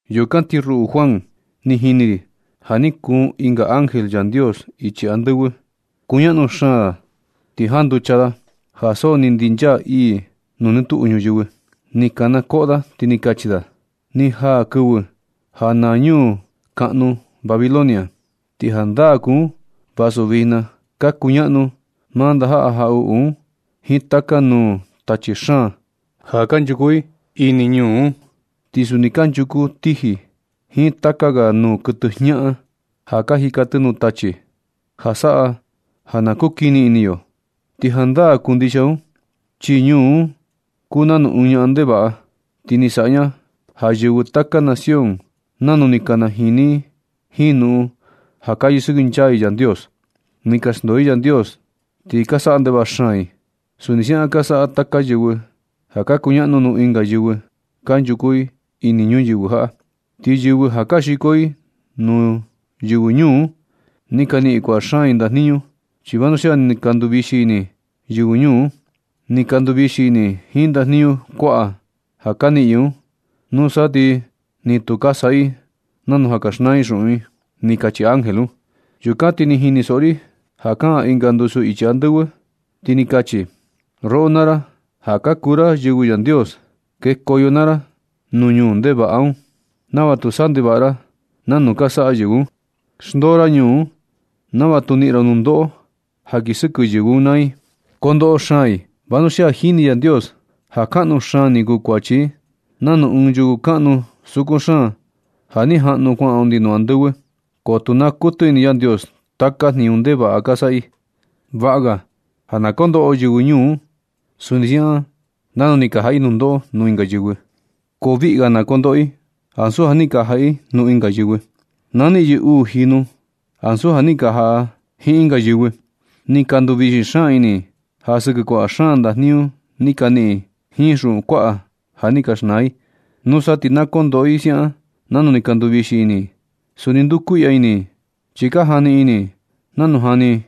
Yukan ti ruꞌu Juan, ni jini ri ja ni kuun ɨnga ángel Yandios ichi andɨvɨ. Kuñaꞌnu xaan da, ti janducha da ja so ni ndinchaa ii nuu nɨ tuꞌu ñuyɨvɨ. Ni kana koꞌo da ti ni kachi da: Ni jaa kɨvɨ ja naa ñuu ñaꞌnu Babilonia. Ti jandaa kuu un vasu vijna ka kuñaꞌnu maa ndajaꞌa jaꞌuꞌu un jiin taka nuu tachi xaan ja kanchuku ini ñuu un. Ti suni kanchuku tiji jiin taka ga nuu kuɨtɨ jñaꞌan ja ka jika tɨ nuu tachi, ja nanu kukini ini yo. Ti jandaa kuu ndixia un chi ñuu un kuu nanu ɨɨn ñaꞌan ndevaꞌa. Ti ni saꞌa ña ja yɨvɨ taka nación nanu ni ka najini i jiin jnuꞌun ja kaa yɨsɨkɨnchaa i Yandios. Ni ka xndoo i Yandios ti ka saꞌa ndevaꞌa xaan i. Suni siaꞌan ka saꞌa taka yɨvɨ ja ka kuñaꞌnu nuu ɨnga yɨvɨ kanchuku ini ñuyɨvɨ jaꞌa. Ti yɨvɨ ja ka xiko i nuu yɨvɨ ñuu un, ni ka niꞌin kuaꞌa xaan i ndajniñu. Chi vanuxia ni ka nduvixi ini yɨvɨ ñuu un. Ni ka nduvixi ini i jiin ndajniñu kuaꞌa ja ka niꞌin yɨ un. Nusa ti ni tu ka saꞌa i nanu ja ka xnaa i xuꞌun i. Ni kachi ángel un. Yukan ti ni jinisoꞌo ri ja kaꞌan ɨnga ndusu ichi andɨvɨ, ti ni kachi: Roꞌo naa ra, ja ka kuu ra yɨvɨ Yandios. Na xndoo ra ñuu ndevaꞌa un, nava tu saꞌa ndevaꞌa ra nanu ka saꞌa yɨvɨ un. Na xndoo ra ñuu un nava tu niꞌin ra nundoꞌo ja kii sɨkɨ yɨvɨ un naa i. Ko kondoꞌo xaan i. Vanuxia jini Yandios ja kaꞌnu xaan ni kuu kuachi i nanu ɨɨn yuku kaꞌnu sukun xaan ja ni jaꞌnu kuaꞌan undi nuu andɨvɨ. Ko tu naa kuɨtɨ ini Yandios taka jniñu ndevaꞌa ka saꞌa i. Vaꞌa ga ja na kondoꞌo yɨvɨ ñuu un suni siaꞌan nanu ni ka jaꞌa i nundoꞌo nuu ɨnga yɨvɨ. Ko viꞌga na kondoꞌo i ansu ja ni ka jaꞌa i nuu ɨnga yɨvɨ. Na niꞌin yɨ uu jinu ansu ja ni ka saꞌa i jiin ɨnga yɨvɨ. Ni ka nduvixi xaan ini i ja sɨkɨ kuaꞌa xaan ndajniñu ni ka niꞌin i jiin xuꞌun kuaꞌa ja ni ka xnaa i. Nusa ti na kondoꞌo i siaꞌan nanu ni ka nduvixi ini i. Suni ndukuiꞌya ini i, chi ka jani ini i nanu jani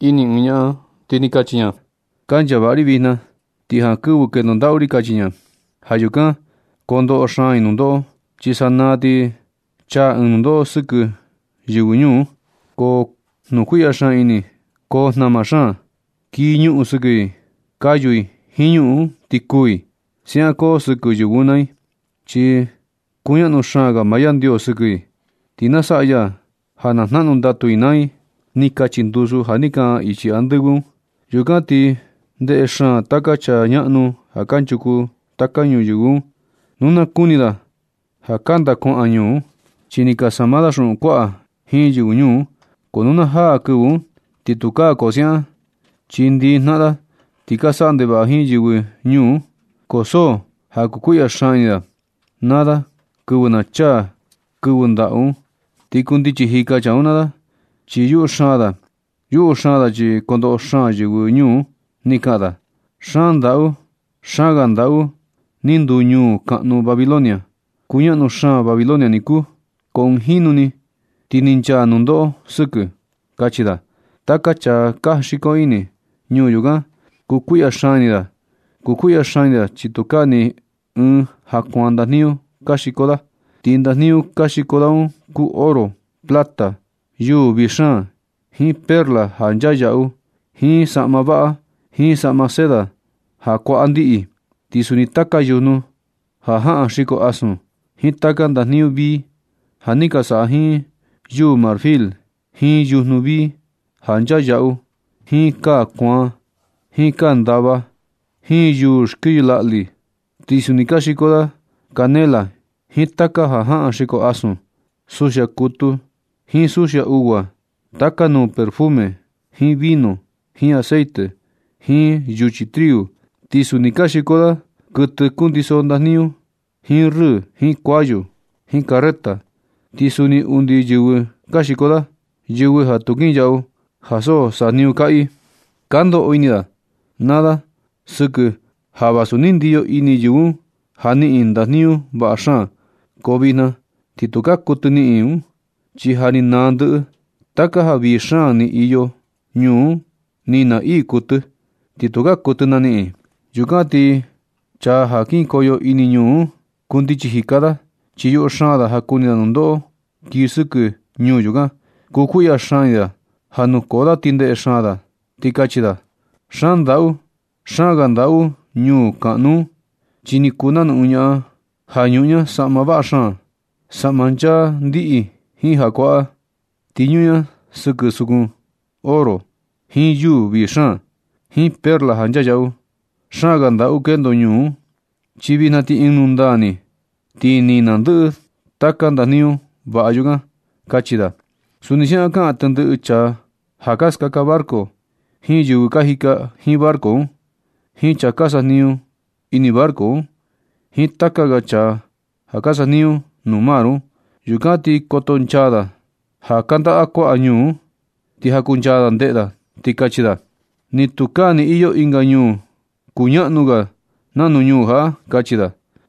ini ɨɨn ñaꞌan, ti kachi ña: “Kancha vaꞌa ri vijna, ti jankɨvɨ kendo ndaꞌu ri”, kachi ña. Ja yukan kondoꞌo xaan i nundoꞌo, chi sanaa ni ti chaa ɨɨn nundoꞌo sɨkɨ yɨvɨ ñuu un. Koo jnukuiꞌya xaan ini i. Koo jnama xaan. Kii ñuꞌun sɨkɨ i, kayu i jiin ñuꞌun un ti kuu i. Siaꞌan koo sɨkɨ yɨvɨ un naa i, chi kuñaꞌnu xaan ga maa Yandios sɨkɨ i. Ti na saꞌa ya ja jnaꞌnu ndatu i naa i. Ni kachi ndusu ja ni kaꞌan ichi andɨvɨ un. Yukan ti ndeꞌe xaan taka chaa ñaꞌnu ja kanchuku taka ñuyɨvɨ nu na kuni da ja kandaꞌa kuaꞌa ñuu un. Chi ni ka sama da xuꞌun kuaꞌa jiin yɨvɨ ñuu un. Ko nu na jaa kɨvɨ un ti tukaa koo siaꞌan. Chi ndɨ jnaꞌan da ni ka saꞌa ndevaꞌa jiin yɨvɨ ñuu un, ko so ja kukuiꞌya xaan ini da naa da kɨvɨ na chaa kɨvɨ ndaꞌu un. Ti kundichi jika chaa un naa da chi yuꞌu xaan da. Yuꞌu xaan da chi kondoꞌo xaan yɨvɨ ñuu un. Ti kaꞌan da: ―¡Xaan ndaꞌu! ¡Xaan ga ndaꞌu ni nduu ñuu kuñaꞌnu Babilonia! ¡Kuñaꞌnu xaan Babilonia niku, ko ɨɨn jinu ni ti ni nchaa nundoꞌo sɨkɨ! ―kachi da. Taka chaa ka janxiko ini ñuu yukan, kukuiꞌya xaan ini da. Kukuiꞌya xaan ini da chi tukaa ni ɨɨn ja kuaan ndajniñu ka xiko da. Ti ndajniñu ka xiko da un kuu oro, plata, yuu vii xaan, jiin perla ja nchaa yaꞌu, jiin saꞌma vaꞌa, jiin saꞌma seda ja kuaꞌa ndiꞌi. Ti suni taka yujnu ja jaꞌan xiko asun, jiin taka ndajniñu vii ja ni ka saꞌa jiin yuu marfil, jiin yujnu vii ja nchaa yaꞌu, jiin kaa kuaan, jiin kaa ndava, jiin yuu xkɨyɨ laꞌlɨ. Ti suni ka xiko da canela jiin taka ja jaꞌan xiko asun, suxia kutu jiin suxia ugua, taka nuu perfume jiin vino, jiin aceite, jiin yuchi triu. Ti suni ka xiko da kuɨtɨ kundiso ndajniñu, jiin rɨɨ, jiin kuayu, jiin carreta, ti suni undi yɨvɨ ka xiko da, yɨvɨ ja tu kinyaꞌu ja so sajniñu kaꞌa i. Ka ndoꞌo ini da naa da sɨkɨ, ja vasu ni ndiyo ini yɨvɨ ñuu un ja niꞌin i ndajniñu vaꞌa xaan, ko vijna ti tukaa kuɨtɨ niꞌin i un. Chi ja ni naa ndɨꞌɨ. Taka ja vii xaan ni iyo ñuu un ni naa ii kuɨtɨ, ti tukaa kuɨtɨ naniꞌin i. Yukan ti chaa ka janxiko ini ñuu un, kundichi jika da, chi yuꞌu xaan da ja kuni da nundoꞌo kii sɨkɨ ñuu yukan. Kukuiꞌya xaan ini da ja nukoo da ti ndeꞌe xaan da. Ti kachi da: ―¡Xaan ndaꞌu! ¡Xaan ga ndaꞌu ñuu ñaꞌnu un! Chi ni kuu nanu ɨɨn ñaꞌan ja ñuꞌun ña saꞌma vaꞌa xaan, saꞌma nchaa ndiꞌi jiin ja kuaꞌa. Ti ñuꞌun ña sɨkɨ sukun oro jiin yuu vii xaan, jiin perla ja nchaa yaꞌu. Xaan ga ndaꞌu kendo ñuu un, chi vijna ti ɨɨn nundaa ni, ti ni naa ndɨꞌɨ taka ndajniñu vaꞌa yukan ―kachi da. Suni siaꞌan kaꞌan tendɨꞌɨ chaa ja ka skaka barco, jiin yɨvɨ ka jika jiin barco un, jiin chaa ka sajniñu ini barco un, jiin taka ga chaa ja ka sajniñu nuu mar un. Yukan ti koto nchaa da ja kandaꞌa kuaꞌa ñuu un, ti jakunchaa da ndeꞌe da, ti kachi da: ―¡Ni tukaa ni iyo ɨnga ñuu ja kuñaꞌnu ga nanu ñuu jaꞌa! ―kachi da.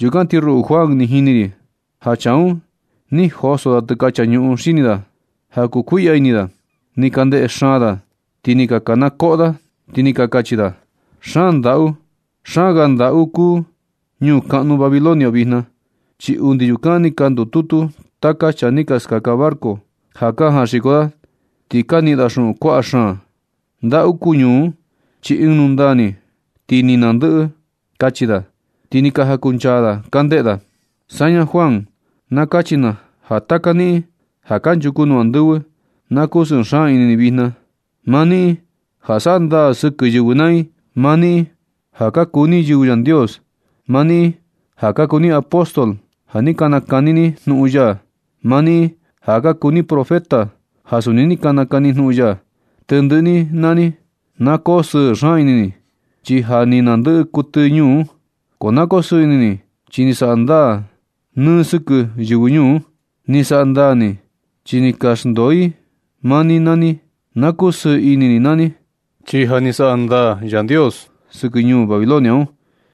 Yukan ti ruꞌu Juan, ni jini ri ja chaa un, ni joso da tɨkacha ñuꞌun xini da ja kukuiꞌya ini da. Ni ka ndeꞌe xaan da, ti ni ka kanakoꞌo da, ti ni ka kachi da: ―¡Xaan ndaꞌu! ¡Xaan ga ndaꞌu kuu ñuu kuñaꞌnu Babilonia vijna! Chi undi yukan ni ka ndututu taka chaa ni ka skaka barco ja ka janxiko da ti ka niꞌin da xuꞌun kuaꞌa. Xaan ndaꞌu kuu ñuu un chi ɨɨn nundaa ni ti ni naa ndɨꞌɨ ni ―kachi da, ti ni ka jakunchaa da ka ndeꞌe da. Saña Juan, na kachi na ja taka niꞌin ja kanchuku nuu andɨvɨ, na kusɨɨ xaan ini ni vijna. Maa niꞌin ja saꞌa ndaa sɨkɨ yɨvɨ naa i, maa niꞌin ja ka kuu ni yɨvɨ Yandios, maa niꞌin ja ka kuu ni apóstol ja ni ka nakani ni jnuꞌun ya, maa niꞌin ja ka kuu ni profeta ja suni ni ka nakani jnuꞌun ya, tendɨꞌɨ ni naa ni na koo sɨɨ xaan ini ni, chi ja ni naa ndɨꞌɨ kuɨtɨ ñuu un. Na koo sɨɨ ini ni, chi ni saꞌa ndaa ni sɨkɨ yɨvɨ ñuu un. Ni saꞌa ndaa ni, chi ni ka xndoo i maa ni naa ni. Na kusɨɨ ini ni naa ni, chi ja ni saꞌa ndaa Yandios sɨkɨ ñuu Babilonia un.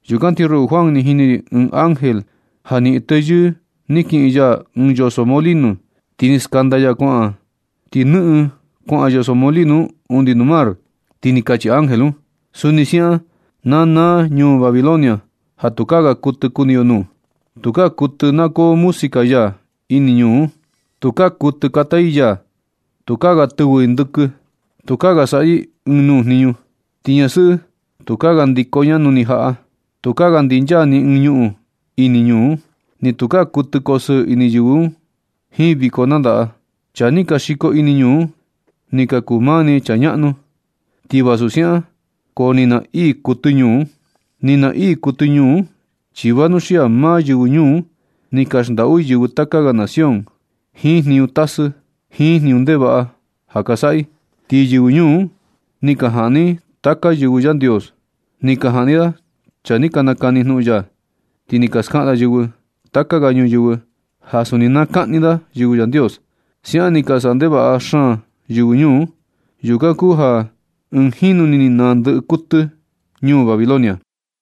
Yukan ti ruꞌu Juan, ni jini ri ɨɨn ángel ja niꞌin teyɨɨ ni kiꞌin ya ɨɨn yoso molino ti ni skanda ya kuaꞌan, ti nɨꞌɨn kuaꞌan yoso molino un undi nuu mar, ti ni kachi ángel un: ―Suni siaꞌan na naa ñuu Babilonia ja tukaa ga kuɨtɨ kuni yo nuu. Tukaa kuɨtɨ na koo música ya ini ñuu un. Tukaa kuɨtɨ kata i yaa. Tukaa ga tɨvɨ i ndɨkɨ. Tukaa ga saꞌa i ni ɨɨn nuu jniñu. Ni ñasɨꞌɨ tukaa ga ndiko ña nuni jaꞌa. Tukaa ga ndinchaa ni ɨɨn ñuꞌun ini ñuu un. Ni tukaa kuɨtɨ kosɨɨ ini yɨvɨ jiin viko nandaꞌa. Chaa ni ka xiko ini ñuu un ni ka kuu maa ni chaa kuñaꞌnu. Ti vasu siaꞌan, ko ni naa ii kuɨtɨ ñuu un. Ni naa ii kuɨtɨ ñuu un, chi vanuxia maa yɨvɨ ñuu un ni ka xndaꞌu i yɨvɨ taka ga nación jiin jniñu tasɨ, jiin jniñu ndevaꞌa ja ka saꞌa i. Ti yɨvɨ ñuu un ni ka jaꞌni i taka yɨvɨ Yandios. Ni ka jaꞌni da chaa ni ka nakani jnuꞌun ya. Ti ni ka skaꞌan da yɨvɨ taka ga ñuyɨvɨ ja suni na kaꞌni da yɨvɨ Yandios. Siaꞌan ni ka saꞌa ndevaꞌa xaan yɨvɨ ñuu un. Yukan kuu ja ɨɨn jinu ni ni naa ndɨꞌɨ kuɨtɨ ñuu Babilonia.